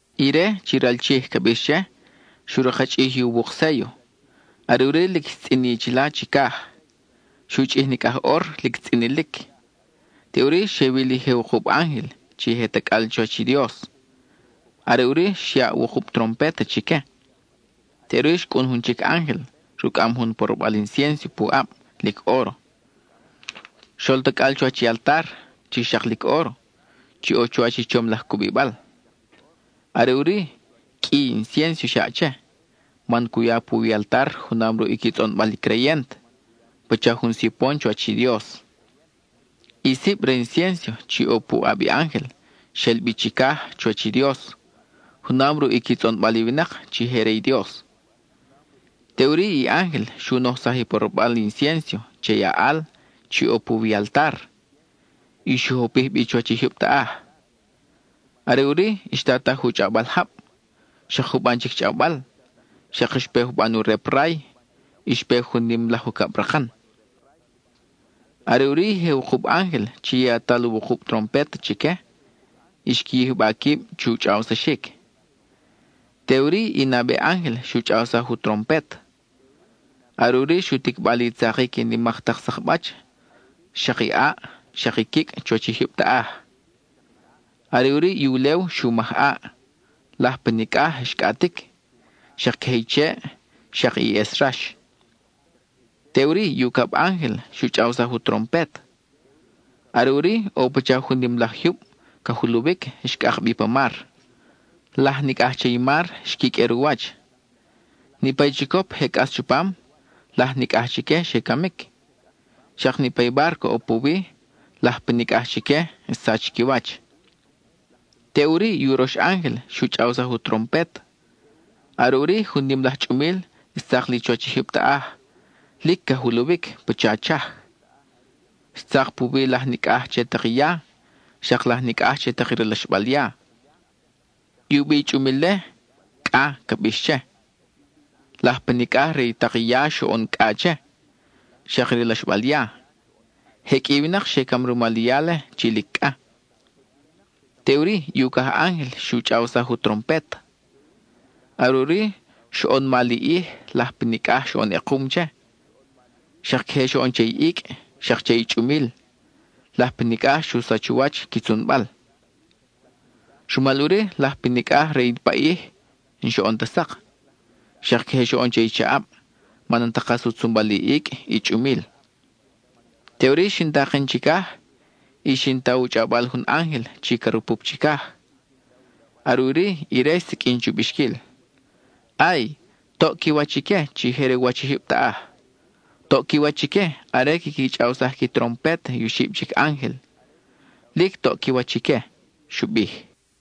Ire, chi ral Chij ca bix che, xu rakchʼij i uwuk séllo; are ʼuri lic xtzʼini chila chicaj; xu chʼij nicʼaj ʼor lic tzʼinilic. Teʼuri, xe wil i je wukub ángel chi je tacʼal chuwach i Dios. Are ʼuri, xyaʼ wukub trompet chique. Teʼuri xcʼun jun chic ángel, rucʼam jun porobal inciénso pu ʼab, lic óro. Xol tacʼal chuwach i altar, chi xak lic óro, chi ʼo chuwach i chom laj cubibal. Are ʼuri, qʼui inciénso xyaʼ che, man cu ya puwi i altar junam ruʼ i qui tzʼonbal i creyent, pacha jun sipon chuwach i Dios. I sib re i inciénso chi ʼo pu ʼab i ángel xel bi chicaj chuwach i Dios, junam ruʼ i qui tzʼonbal i winak chi je re i Dios. Teʼuri i ángel xu nojsaj i porobal inciénso che i aʼal chi ʼo puwi i altar; y xu jopij bi chuwach i jyub taʼaj. Are ʼuri xtataj u chʼawbal jab, xak juban chic chʼawbal, xak xpe juban u rep ray, y xpe jun nim laj ucabrakan. Are ʼuri i je wukub ángel chi yatal wukub trompet chique, xqui yijba quib chu chʼawsaxic. Teʼuri i nabe ángel xu chʼawsaj u trompet. Are ʼuri xu ticba li tzakic i nimak tak sakbach, xak i ʼaʼ, xak i quicʼ chuwach i jyub taʼaj. Are ʼuri i ulew xu maj ʼaʼ, laj pa nicʼaj xcʼatic, xak queje i cheʼ, xak i ʼes rax. Teʼuri i ucab ángel xu chʼawsaj u trompet. Are ʼuri, ʼo pacha jun nim laj jyub ca juluwic xcʼak bi pa mar; laj nicʼaj che i mar xquiqʼuer u wach. Niʼpa i chicop je cʼas chupam, laj nicʼaj chique xe camic. Xak niʼpa i bárco ʼo puwi, laj pa nicʼaj chique xsach qui wach. Teʼuri i urox ángel xu chʼawsaj u trompet. Are ʼuri jun nim laj chʼumil xtzak li chuwach i jyub taʼaj, lic ca juluwic pacha chaj. Xtzak puwi laj nicʼaj che tak i ya, xak laj nicʼaj che tak i ralaxbal ya. I u bi i chʼumil-le, “Cʼa” ca bix che. Laj pa nicʼaj re i tak i ya xoʼon cʼa che, xak i ralaxbal ya. Je qʼui i winak xe cam rumal i ya-le, chi lic cʼa. Teʼuri i ucaj ángel xu chʼawsaj u trompet. Are ʼuri, xoʼon mal i ʼij; laj pa nicʼaj xoʼon ʼekum che. Xak queje xoʼon che i icʼ, xak che i chʼumil; laj pa nicʼaj xu sach u wach qui tzunbal. Rumal ʼuri, laj pa nicʼaj re i paʼij n-xoʼon ta sak, xak queje xoʼon che i chaʼab, man n-ta kas u tzunbal i icʼ, i chʼumil. Teʼuri xin taken chicaj, y xin ta u chʼawbal jun ángel chi ca rupup chicaj. Are ʼuri ire xsiqʼuin chu bixquil: —¡Ay! ¡Toʼ qui wach ique chi je re u wach i jyub taʼaj! ¡Toʼ qui wach ique are quiqui chʼawsaj qui trompet i oxib chic ángel! ¡Lic toʼ qui wach ique! —xu bij.